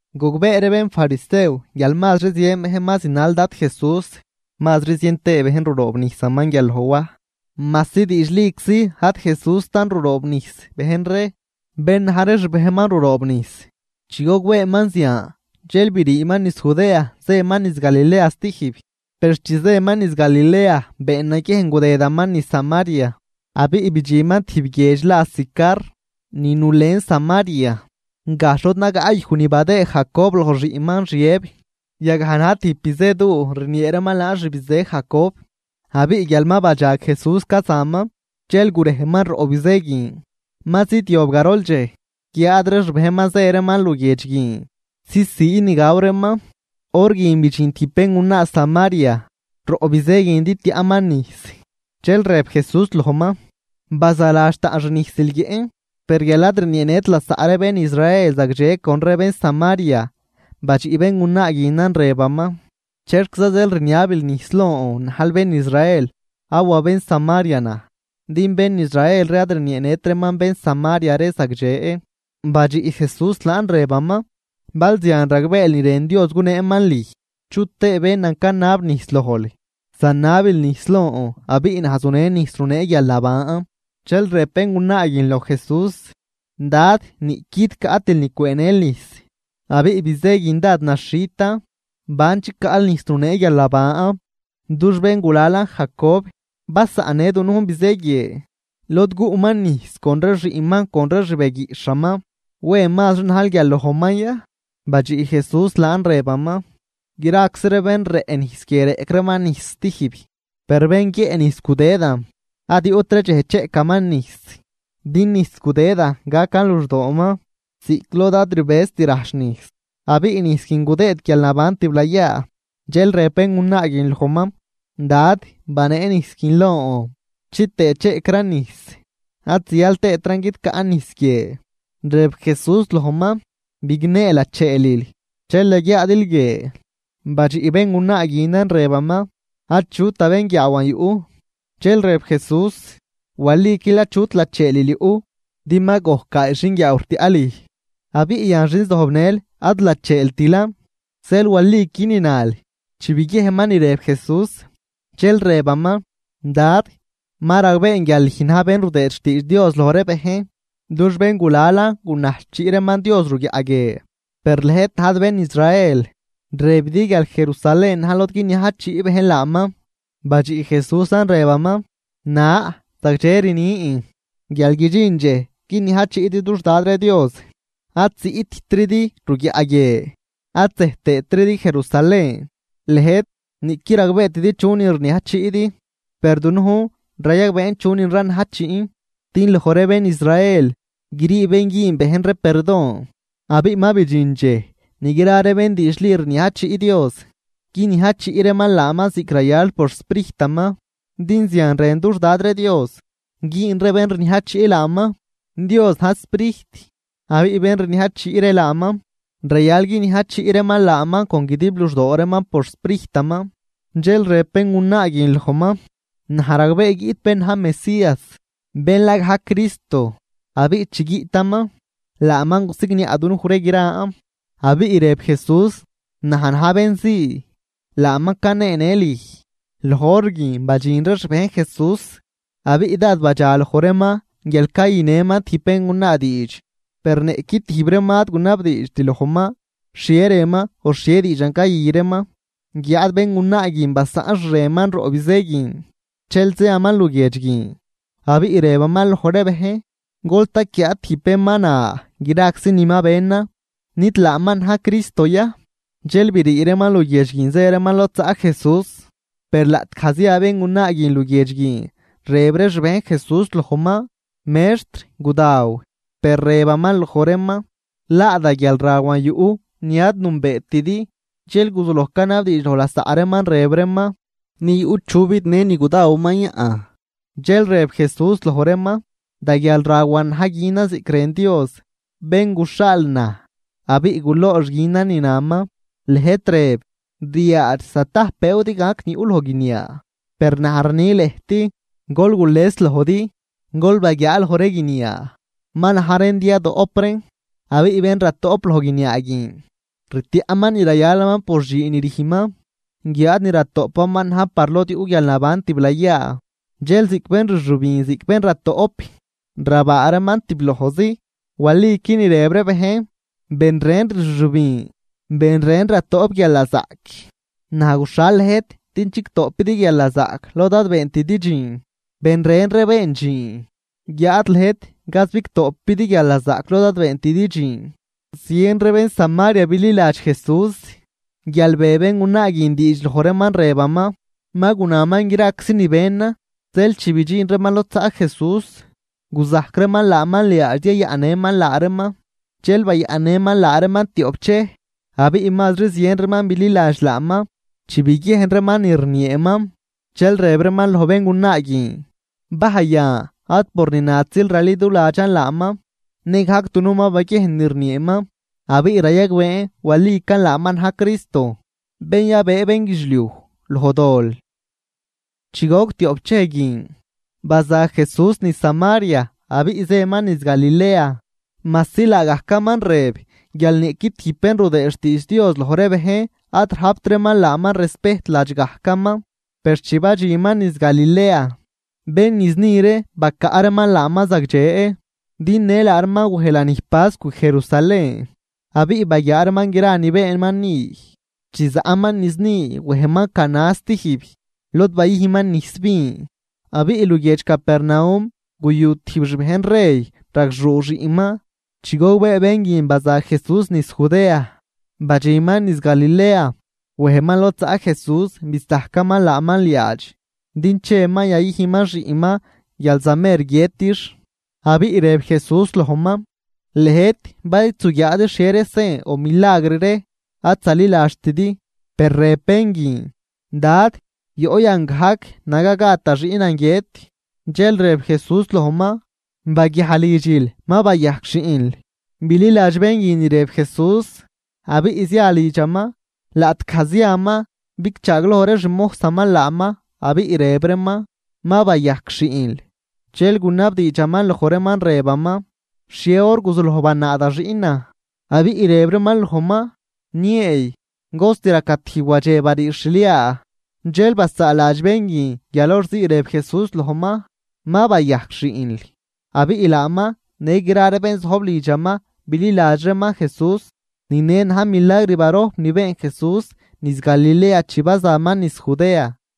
Gogbee ree bénfarisew guial mazri zien bejn ma zinal Dad Jesús mazri zien tëë bejn ruroobnijsaman guial loj Waj, majsi diidxliczi ad Jesústan ruroobnijs bejn ree, bén na̱j ree xbejnman ruroobnijs. Chi gogbeeman zian dxel briiman niz Judea zëman niz Galilea stijb. Per chi zëman niz Galilea been naguiejn gudëdaman niz Samaria. Abiꞌ bidxinman tijb guiedx la Sicar, ni nulen Samaria, gajxh lod nagaꞌ yuj ni badëë Jacob loj xiꞌnman Xiëb. Yagaj na̱j tijb bizëduu rniee reeman laan xbizë Jacob. Abiꞌ guial ma badxag Jesús cazaman, dxel gurejman roꞌ bizë guin. Ma zidyob garol dxej. Guiáad ree xbejnman zë reeman luguiedx guin zisii ni gaw reeman. Hor guin bidxin tijb béngunaa Samaria roꞌ bizë guin din tiaꞌman nijs, dxel rëb Jesús lojman: ―Bazaladx taꞌn xnijsil guiëꞌn. Per guial ad rnieenët lasaꞌ ree bén Israel zagdxe con ree bén Samaria, badxiꞌ béngunaa guinan rëbaman: ―¿Chexquiza zeel rniabil nijs lon najl bén Israel awa bén Samaria naj? (Din bén Israel ree ad rnieenët reeman bén Samaria ree zagdxe.) Badxiꞌ Jesús laan rëbaman: ―Bal zian ragbeel ni rën Dios guneeman lüj, chutëë bénan canab nijs lojl, zanabil nijs lon abiꞌ naj zunen nijs runee guialnaban. Dxel rëb béngunaa guin loj Jesús: ―Dad, niꞌquid caꞌtil ni cwëënël nijs, abiꞌ bizë guin dád naxhitan. ¿Ban chicaꞌl nijs runee guialnaban? Dux béngulalan Jacob basaꞌnnë dunujn bizë guie, lod guꞌman nijs con ree xiꞌnman con ree xbeguiꞌxhaman. ¿Wen mazri najl guial lojman ya? Badxiꞌ Jesús laan rëbaman: ―Graczi ree bén rëꞌ nijs guie reꞌc reeman nijs stijb. Per bén guiëꞌ nijs gudëdan, ad yuꞌtri dxej cheꞌcaman nijs. Din nijs gudëdan gacan luxdooman ziꞌc lod ad rbëzt rajch nijs, abiꞌ nijs guin gudëë guialnaban tiblayaa. Dxel rëb béngunaa guin lojman: ―Dad, banee nijs guin lon, chitëë cheꞌcran nijs ad zial tëëtran guidcaꞌn nijs guie. Rëb Jesús lojman: ―Bignee lacheelil, dxel yaguiaadil guie. Badxiꞌ béngunaa guinan rëbaman: ―Achut da bénguiaawan yuꞌ. Dxel rëb Jesús: ―Waliquil achut lacheelil yuꞌ, din ma gojc gaay xinguiaaw rtiaꞌ lüj, abiꞌ yan xin zojbnël ad lacheeltilan. Zeel waliqui ni nal. Chi biguiejnman ni rëb Jesús, dxel rëbaman: ―Dad, ma ragbeen guial lüj na̱j bén rudëë xtiidx Dios loj ree bejn. Dux béngulalan gunajchiꞌ reeman Dios ruguiaꞌ guie, per lëjt najdi bén Israel rëbidi guial Jerusalén na̱j lod guiniajchiꞌ bejn laaman. Badxiꞌ Jesúsan rëbaman: ―Na, zagdxe rnin guial guidxin dxej guiniajchiꞌdi dux Dad ree Dios, ad ziꞌttridi ruguiaꞌ guie ad zej tëëtridi Jerusalén. Lëjt niꞌquid ragbeetidi chunin rniajchiꞌdi, per dunujn rayagbeen chunin ranajchiꞌn, din loj ree bén Israel grii bén güün bejn ree perdon. Abiꞌ ma bidxin dxej ni gra ree bén diidxli rniajchiꞌ Dios, guiniajchiꞌ reeman laaman ziꞌc rayal por xSprijtaman. Din zian rën dux Dad ree Dios güün ree bén rniajchiꞌ laaman. Dios na̱j Sprijt, abiꞌ bén rniajchiꞌ ree laaman rayal guiniajchiꞌ reeman laaman con guidib luxdoo reeman por xSprijtaman. Dxel rëb béngunaa guin lojman: ―Naj ragbee guiꞌt bén na̱j Mesías, bén la gajc, Cristo. Abiꞌ chi guiꞌtaman, laaman gusigniaꞌ dunuj ree gran. Abiꞌ rëb Jesús: ―Najn na̱j bén zii, laaman caneenë lüj. Loj hor guin badxin ree xbejn Jesús, abiꞌ dád badxaloj reeman guial cayünëman tijb béngunaa diidx. Per niꞌqui tijb reeman ad gunabdiidxt lojman xhie rënman o xhie diidxan cayü reeman. Guiáad béngunaa guin basaꞌn xreman roꞌ bizë guin, dxel ziaman luguiedx guin, abiꞌ rëbaman loj ree bejn: ―Gol taquiaa tijb bén ma na graczi ni ma benan. ¿Nid laaman na̱j Cristo ya? Dxel brii reeman luguiedx guin zë reeman lod zaꞌ Jesús. Per laꞌtgaj zia béngunaa guin luguiedx guin, rëb ree xbejn Jesús lojman: ―Mextr, gudaw. Per rëbaman loj reeman: ―Laa da guialrawan yuꞌ, ni ad nünbeetidi. Dxel guzuloj canabdiidx loj lasaꞌ reeman rëb reeman: ―¿Ni yuꞌ chu bidnë ni gudawaman yaꞌn? Dxel rëb Jesús loj reeman: ―Da guialrawan na̱j günan ziꞌc rën Dios, bén guxhaal naj abiꞌ guloox günan ni naman. Lëjt rëb: “Ryaadx zatajp bëëw din gac ni yuꞌ loj guiniaa.” Per naj rni lëjt: Gol gules lojdi, gol baguiaa loj ree guiniaa, ma na̱j reen din yadoꞌp reen. Abiꞌ bén ratoꞌp loj guiniaa guin, rtiaꞌman ni rayalaman por dxiin ni rüjnman. Guiáad ni ratoꞌpaman na̱j par lod yuꞌ guialnaban tiblayaa. Dxel ziꞌc bén rxübin ziꞌc bén ratoꞌp, rabaa reeman tiblojzi. Waliqui ni rëb ree bejn: “Ben ren rxübin, ben ren ratoꞌp guialnazaꞌc.” Naj guxhal lëjt din chigtoꞌpidi guialnazaꞌc lod ad beentidi dxiin. Ben ren ree been dxiin, guiáad lëjt gaz bigtoꞌpidi guialnazaꞌc lod ad beentidi dxiin. Zien ree bén Samaria bililadx Jesús guial be béngunaa guin diidx loj reeman rëbaman: “Ma gunaman graczi ni benan.” Zeel chi bidxin reeman lod zaꞌ Jesús, guzajc reeman laaman liaadx din yayaꞌnnëman laa reeman. Dxel bayaꞌnnëman laa reeman tioꞌp dxej. Abiꞌ mazri zien reeman bililadx laaman chi biguiejn reeman ni rnieeman, dxel rëb reeman loj béngunaa guin: ―Bajy yan ad por ni natzil raliduladxan laaman, nëgajc dunujn ma baguiejn ni rnieeman, abiꞌ rayagbeen walican laaman na̱j Cristo, bén yabëë bénguidxliuj loj dol. Chi goc tioꞌp dxej guin, baza Jesús niz Samaria abiꞌ zëman niz Galilea, majsi laagajcaman rëb guial niꞌqui tijb bén rudëë xtiidx Dios loj ree bejn ad rajpt reeman laaman respejt ladx gajcaman. Per chi badxinman niz Galilea, bén niz ni ree bacaꞌ reeman laaman zagdxe. Din në laa reeman wej lanij pascw Jerusalén, abiꞌ baguiaa reeman gra ni beenman ni. Chi zaꞌman niz ni wejman Caná stijb, lod bayüjnman nijs vin. Abiꞌ luguiedx Capernaum guyu tijb xbejn rey ragxuu xiꞌnman. Chi gogbee bén guin baza Jesús niz Judea badxinman niz Galilea, wejman lod zaꞌ Jesús bisajcaman laaman liaadx din cheman yayüjnman xiꞌnman guial zamer guiëtix. Abiꞌ rëb Jesús lojman: ―Lëjt, bal id zuguiaadi xhie ree sen o milagr ree, ad zaliladxtidi. Per rëb bén guin: ―Dad, yoꞌ yan gajc, naga gad da xiꞌnan guiët. Dxel rëb Jesús lojman: ―Baguiaj lidxil, ma bayajc xiꞌnl. Bililadx bén guin ni rëb Jesús, abiꞌ zia lidxaman. Laꞌtgaj ziaman, bigchaagloj ree xmojsaman laaman, abiꞌ rëb reeman: ―Ma bayajc xiꞌnl. Dxel gunabdiidxaman loj reeman, rëbaman: ―¿Xhie hor guzuloj banaa da xiꞌnan? Abiꞌ rëb reeman lojman: ―Nieey cost raca tijb wadxe bariix xliaa. Dxel basaaladx bén guin guial hor ziin rëb Jesús lojman: “Ma bayajc xiꞌnl.” Abiꞌ laaman në gra bén zojb lidxaman bililadx reeman Jesús. Ni ne na̱j milagr barojp ni been Jesús niz Galilea chi bazaman niz Judea.